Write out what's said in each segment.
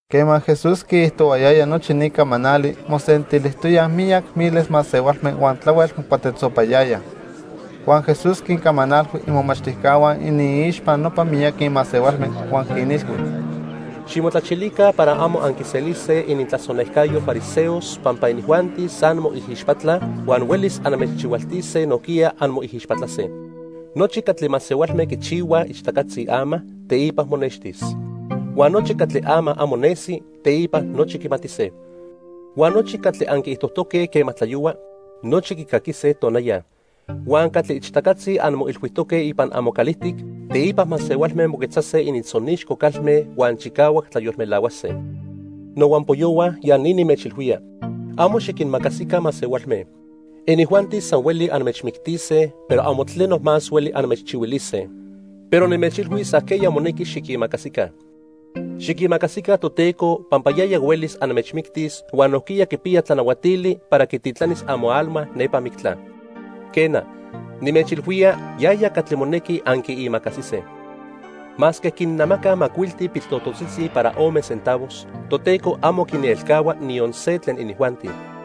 Quema Jesús quiijtohuayaya nochi ni camanali, mosentilijtoyaj miyac miles masehualme huan tlahuel mocuatetzopayayaj. Huan Jesús quincamanalhui imomachtijcahua iniixpa nopa miyaqui masehualme huan quinilhui: "Ximotlachilica para amo anquiselise inintlasonejcayo fariseos pampa inijuanti san moijixpatlaj huan huelis anmechchihualtise nojquiya anmoijixpatlase. Nochi catli masehualme quichihuaj ichtacatzi ama, teipa monextis. Huan nochi catli ama amo nesi, teipa nochi quimatise. Huan nochi catli anquiijtojtoque quema tlayohua, nochi quicaquise tonaya. Huan catli ichtacatzi anmoilhuijtoque ipan amocalijtic, teipa masehualme moquetzase inintzonixco calme huan chicahuac tlayolmelahuase. "Nohuampoyohua ya ni nimechilhuía. Amo xiquinimacasica masehualme. Inijuanti san hueli anmechmictise, pero amo tleno más hueli anmechchihuilise. Pero nimechilhuis ajqueya monequi xiquimacasica. Xiquimacasica Toteco, pampa yaya huelis anmechmictis huan nojquiya quipiya tlanahuatili para quititlanis amoalma nepa mictla. Quena, nimechilhuía, yaya catli monequi anquiimacasise. "Masque quinnemacaj macuilti piltototzitzi para ome centavos, Toteco amo quielcahua niyon se tlen inijuanti.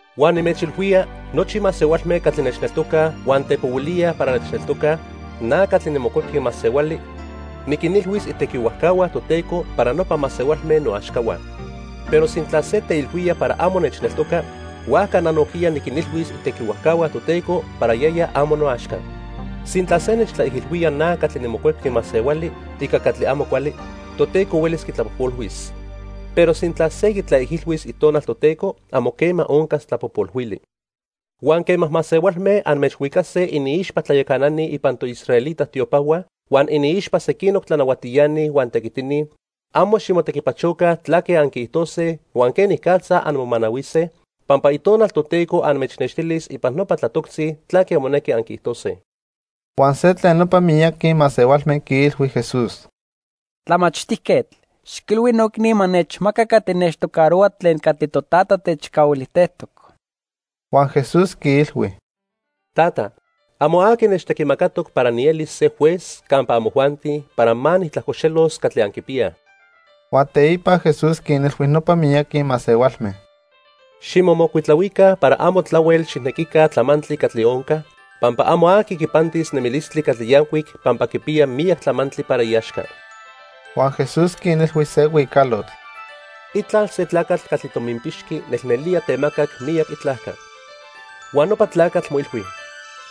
"Huan nimechilhuía, nochi masehualme catli nechneltocaj huan tepohuilíaj para nechneltocaj, na catli niMocuepqui Masehuali, niquinilhuis itequihuajcahua Toteco para nopa masehualme noaxcahua. Pero sintla se teilhuía para amo nechneltoca, huajca na nojquiya niquinilhuis itequihuajcahua Toteco para yaya amo noaxca. "Sintla se nechtlaijilhuía na catli niMocuepqui Masehuali ica catli amo cuali, Toteco huelis quitlapojpolhuis. Pero sintla se quitlaijilhuis Itonal Toteco, amo quema oncas tlapojpolhuili. "Huan quema masehualme anmechhuicase iniixpa tlayacanani ipan toisraelita tiopahua huan iniixpa sequinoc tlanahuatiani huan tequitini, amo ximotequipachoca tlaque anquiijtose huan quenicatza anmomanahuise, pampa Itonal Toteco anmechnextilis ipan nopa tlatoctzi tlaque monequi anquiijtose." Huan se tlen nopa miyaqui masehualme quiilhui Jesús: —Tlamachtijquetl, xiquilhui noicni ma nechmaca catli nechtocarohua tlen catli totata techcahuilijtejtoc. Huan Jesús quiilhui: —Tata, amo aqui nechtequimacatoc para nielis se juez campa amojuanti para ma nijtlajcoxelos catli anquipiyaj. Huan teipa Jesús quinilhui nopa miyaqui masehualme: —Ximomocuitlahuica para amo tlahuel xijnequica tlamantli catli onca, pampa amo aqui quipantis nemilistli catli yancuic pampa quipiya miyac tlamantli para iaxca. Huan Jesús quinilhui se huicalotl: "Itlal se tlacatl catli tominpixqui nelnelía temacac miyac itlajca. Huan nopa tlacatl moilhui: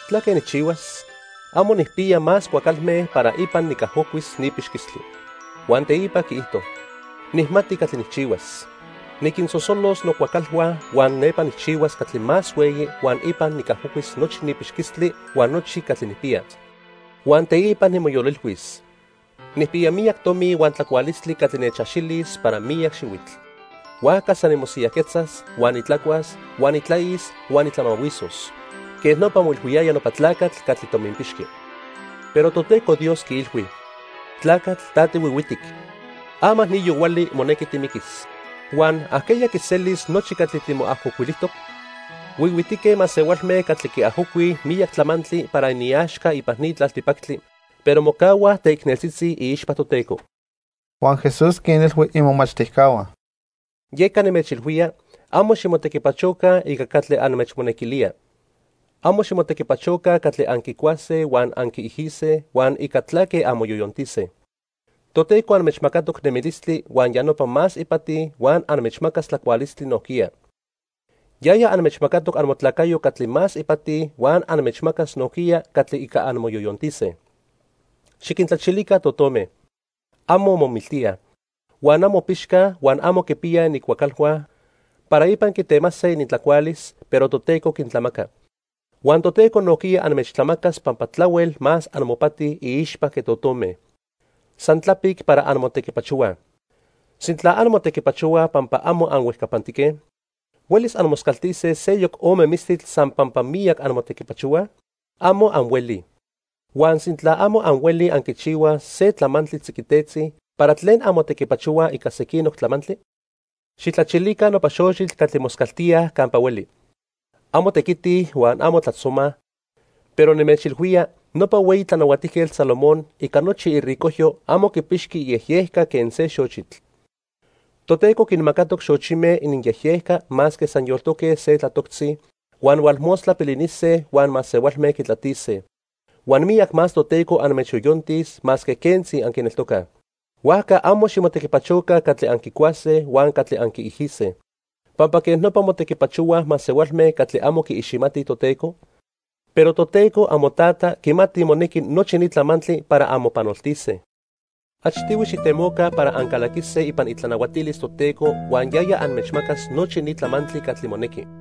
'¿Tlaque nijchihuas? Amo nijpiya más cuacalme para ipan nicajocuis ni pixquistli.' Huan teipa quiijto: 'Nijmati catli nijchihuas. Niquinsosolos nocuacalhua huan nepa nijchihuas catli más hueyi huan ipan nicajocuis nochi ni pixquistli huan nochi catli nijpiya.' Huan teipa nimoyolilhuis: 'Nijpiya miyac tomi huan tlacualistli catli nechaxilis para miyac xihuitl. Huajca san nimosiyajquetzas, huan nitlacuas, huan nitlais huan nitlamahuisos.' Quej nopa moilhuiyaya nopa tlacatl catli tominpixqui. Pero Toteco Dios quiilhui: 'Tlacatl ta tihuihuitic. Ama ni yohuali monequi timiquis, huan ¿ajqueya quiselis nochi catli timoajocuilijtoc?' Huihuitique masehualme catli quiajocuij miyac tlamantli para iniaxca ipan ni tlaltipactli, pero mocahuaj teicneltzitzi iixpa Toteco." Huan Jesús quinilhui imomachtijcahua: "Yeca nimechilhuía, amo ximotequipachoca ica catli anmechmonequilía. Amo ximotequipachoca catli anquicuase huan anquiijise huan ica tlaque anmoyoyontijtose. Toteco anmechmacatoc nemilistli huan ya nopa más ipati huan anmechmacas tlacualistli nojquiya. Yaya anmechmacatoc amotlacayo catli más ipati huan anmechmacas nojquiya catli ica anmoyoyontise. Xiquintlachilica totome. Amo momiltíaj, huan amo pixcaj huan amo quipiyaj inincuacalhua para ipan quitemase inintlacualis, pero Toteco quintlamaca. Huan Toteco nojquiya anmechtlamacas pampa tlahuel más amopati iixpa que totome. San tlapic para anmotequipachohuaj. Sintla anmotequipachohuaj pampa amo anhuejcapantique, ¿huelis anmoscaltise seyoc ome mistitl san pampa miyac anmotequipachohuaj? Amo anhuelij. Huan sintla amo anhuelij anquichihuaj se tlamantli tziquitetzi, ¿para tlen anmotequipachohuaj ica sequinoc tlamantli? "Xijtlachilica nopa xochitl catli moscaltíaj campa hueli. Amo tequitij huan amo tlajtzomaj, pero nimechilhuía, nopa hueyi Tlanahuatijquetl Salomón ica nochi iricojyo amo quipixqui iyejyejca quen se xochitl. Toteco quinmacatoc xochime ininyejyejca masque san yoltoque se tlatoctzi, huan hualmostla pilinise huan masehualme quitlatise. Huan miyac más Toteco anmechyoyontis masque quentzi anquineltocaj. Huajca amo ximotequipachoca catli anquicuase huan catli anquiijise, pampa quej nopa motequipachohuaj masehualme catli amo quiiximatij Toteco, pero Toteco amoTata quimati monequi nochi ni tlamantli para anmopanoltise. Achtihui xijtemoca para ancalaquise ipan itlanahuatilis Toteco huan yaya anmechmacas nochi ni tlamantli catli monequi.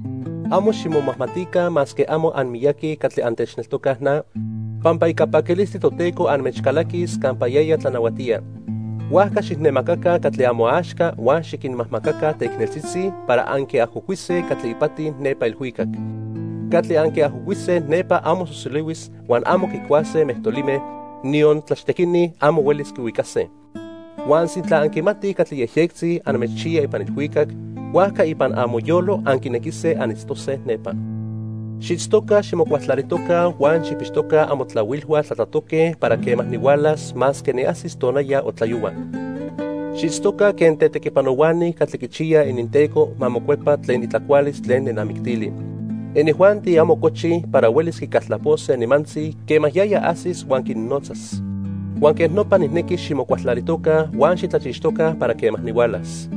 "Amo ximomajmatica masque amo anmiyaqui catli antechneltocaj na, pampa ica paquilistli Toteco anmechcalaquis campa yaya tlanahuatía. Huajca xijnemacaca catli amoaxca huan xiquinmajmacaca teicneltzitzi para anquiajocuise catli ipati nepa ilhuicac. Catli anquiajocuise nepa amo sosolihuis huan amo quicuase mejtolime, niyon tlachtequini amo huelis quihuicase. Huan sintla anquimatij catli yejyectzi anmechchiya ipan ilhuicac, huajca ipan amoyolo anquinequise anitztose nepa. "Xiitztoca ximocualtlalijtoca huan xijpixtoca amotlahuilhua tlatlatoque para quema nihualas masque niajsis tonaya o tlayohua. Xiitztoca quen tetequipanohuani catli quichiyaj ininteco ma mocuepa tlen itlacualis tlen nenamictili. Inijuanti amo cochij para huelis quicaltlapose nimantzi quema yaya ajsis huan quinnotzas. Huan quej nopa nijnequi ximocualtlalijtoca huan xitlachixtoca para quema nihualas.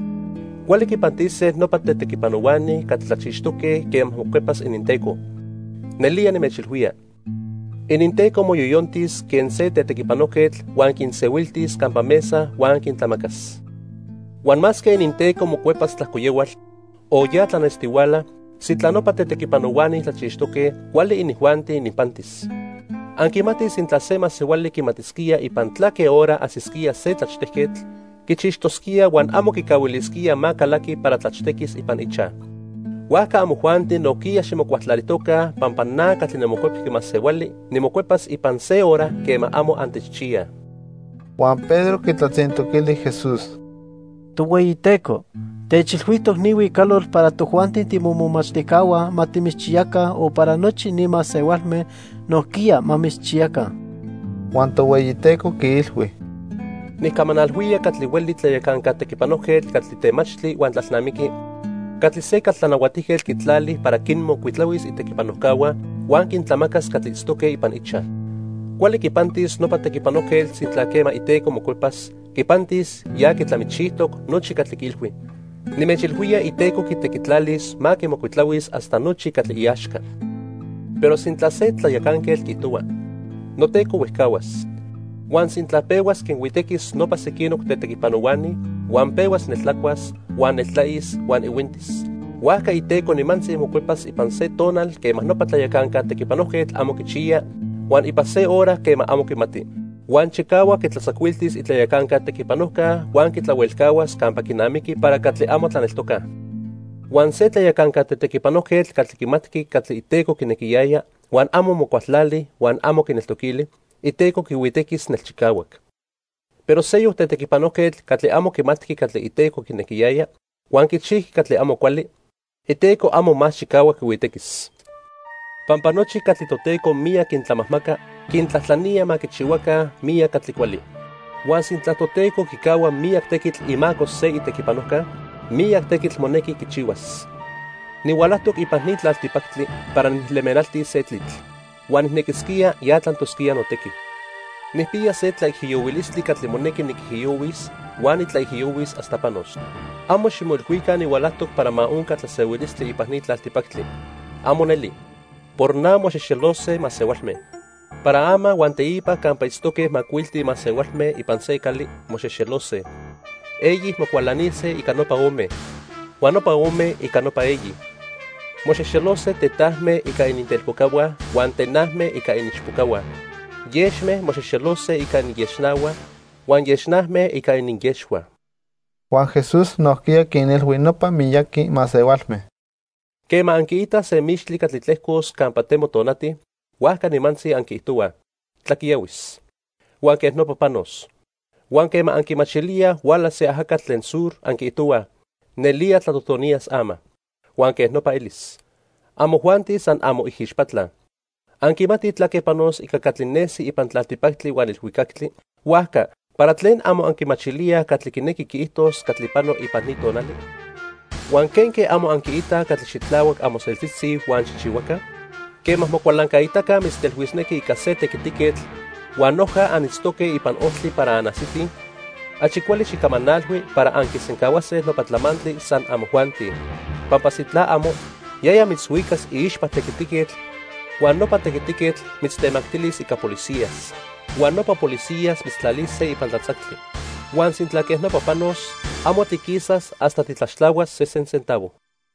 Cuali quipantise nopa tetequipanohuani catli tlachixtoque quema mocuepas ininteco. Nelía nimechilhuía, ininteco moyoyontis quen se tetequipanojquetl huan quinsehuiltis campa mesa huan quintlamacas. Huan masque ininteco mocuepas tlajcoyohual o ya tlanestihuala, sintla nopa tetequipanohuani tlachixtoque, cuali inijuanti ininpantis. Anquimatij sintla se masehuali quimatisquía ipan tlaque hora ajsisquía se tlachtejquetl, quichixtosquía huan amo quicahuilisquía ma calaqui para tlachtequis ipan ichaj. Huajca amojuanti nojquiya ximocualtlalijtoca pampa na catli niMocuepqui Masehuali nimocuepas ipan se hora quema amo antechchiyaj." Huan Pedro quitlatzintoquili Jesús: —Tohueyiteco, ¿techilhuijtoc ni huicalotl para tojuanti timomomachtijcahua ma timitzchiyaca o para nochi ni masehualme nojquiya ma mitzchiyaca? Huan Tohueyiteco quiilhui: "Nijcamanalhuía catli hueli tlayacanca tequipanojquetl catli temachtli huan tlalnamiqui catli se caltlanahuatijquetl quitlali para quinmocuitlahuis itequipanojcahua huan quintlamacas catli itztoque ipan ichaj. Cuali quipantis nopa tequipanojquetl sintla quema iteco mocuepas, quipantis ya quitlamichijtoc nochi catli quiilhui. Nimechilhuía iteco quitequitlalis ma quimocuitlahuis hasta nochi catli iaxca. Pero sintla se tlayacanquetl quiijtohua: 'Noteco huejcahuas.' Huan sintla pehuas quinhuitequis nopa sequinoc tetequipanohuani, huan pehuas neltlacuas, huan neltlais huan ihuintis, huajca iteco nimantzi mocuepas ipan se tonal quema nopa tlayacanca tetequipanojquetl amo quichiya, huan ipan se hora quema amo quimati. Huan chicahuac quitlatzacuiltis itlayacanca tequipanojca huan quitlahuelcahuas campa quinamiqui para catli amo tlaneltocaj. "Huan se tlayacanca tetequipanojquetl catli quimatqui catli iteco quinequiyaya huan amo mocualtlali huan amo quineltoquili, iteco quihuitequis nelchicahuac. Pero seyoc tetequipanojquetl catli amo quimatqui catli iteco quinequiyaya, huan quichijqui catli amo cuali, iteco amo más chicahuac quihuitequis. Pampa nochi catli Toteco miyac quintlamajmaca, quintlajtlanía ma quichihuaca miyac catli cuali. Huan sintla Toteco quicahua miyac tequitl imaco se itequipanojca, miyac tequitl monequi quichihuas. "Nihualajtoc ipan ni tlaltipactli para nijlemenaltis se tlitl. Huan nijnequisquía ya tlantosquía notequi. Nijpiya se tlaijiyohuilistli catli monequi niquijiyohuis huan nitlaijiyohuis hasta panos. Amo ximoilhuica nihualajtoc para ma onca tlasehuilistli ipan ni tlaltipactli. ¡Amo neli! Por na, moxexelose masehualme. Para ama huan teipa campa itztoque macuilti masehualme ipan se cali, moxexelose. Eyi mocualanise ica nopa ome, huan nopa ome ica nopa eyi. Moxexelose tetajme ica inintelpocahua huan tename ica iniichpocahua. Yexme moxexelose ica ininyexnahua, huan yexname ica ininyexhua." Huan Jesús nojquiya quinilhui nopa miyaqui masehualme: "Quema anquiitaj se mixtli catli tlejcos campa temo tonati, huajca nimantzi anquiijtohuaj: 'Tlaquiyahuis', huan quej nopa panos. Huan quema anquimachilíaj huala se ajacatl tlen sur, anquiijtohuaj: 'Nelía tlatotoniyas ama.' Huan quej nopa elis. Amojuanti san anmoijixpatlaj. Anquimatij tlaque panos ica catli nesi ipan tlaltipactli huan ilhuicactli, huajca ¿para tlen amo anquimachilíaj catli quinequi quiijtos catli pano ipan ni tonali? "Huan, ¿quenque amo anquiitaj catli xitlahuac amoseltzitzi huan xijchihuaca? Quema mocualancaitaca mitztelhuisnequi ica se tequitiquetl huan noja anitztoque ipan ojtli para anajsitij, achi cuali xijcamanalhui para anquisencahuase nopa tlamantli san amojuanti. Pampa sintla amo, yaya mitzhuicas iixpa tequitiquetl huan nopa tequitiquetl mitztemactilis ica policías, huan nopa policías mitztlalise ipan tlatzactli. Huan sintla quej nopa panos, amo tiquisas hasta titlaxtlahuas sesen centavo."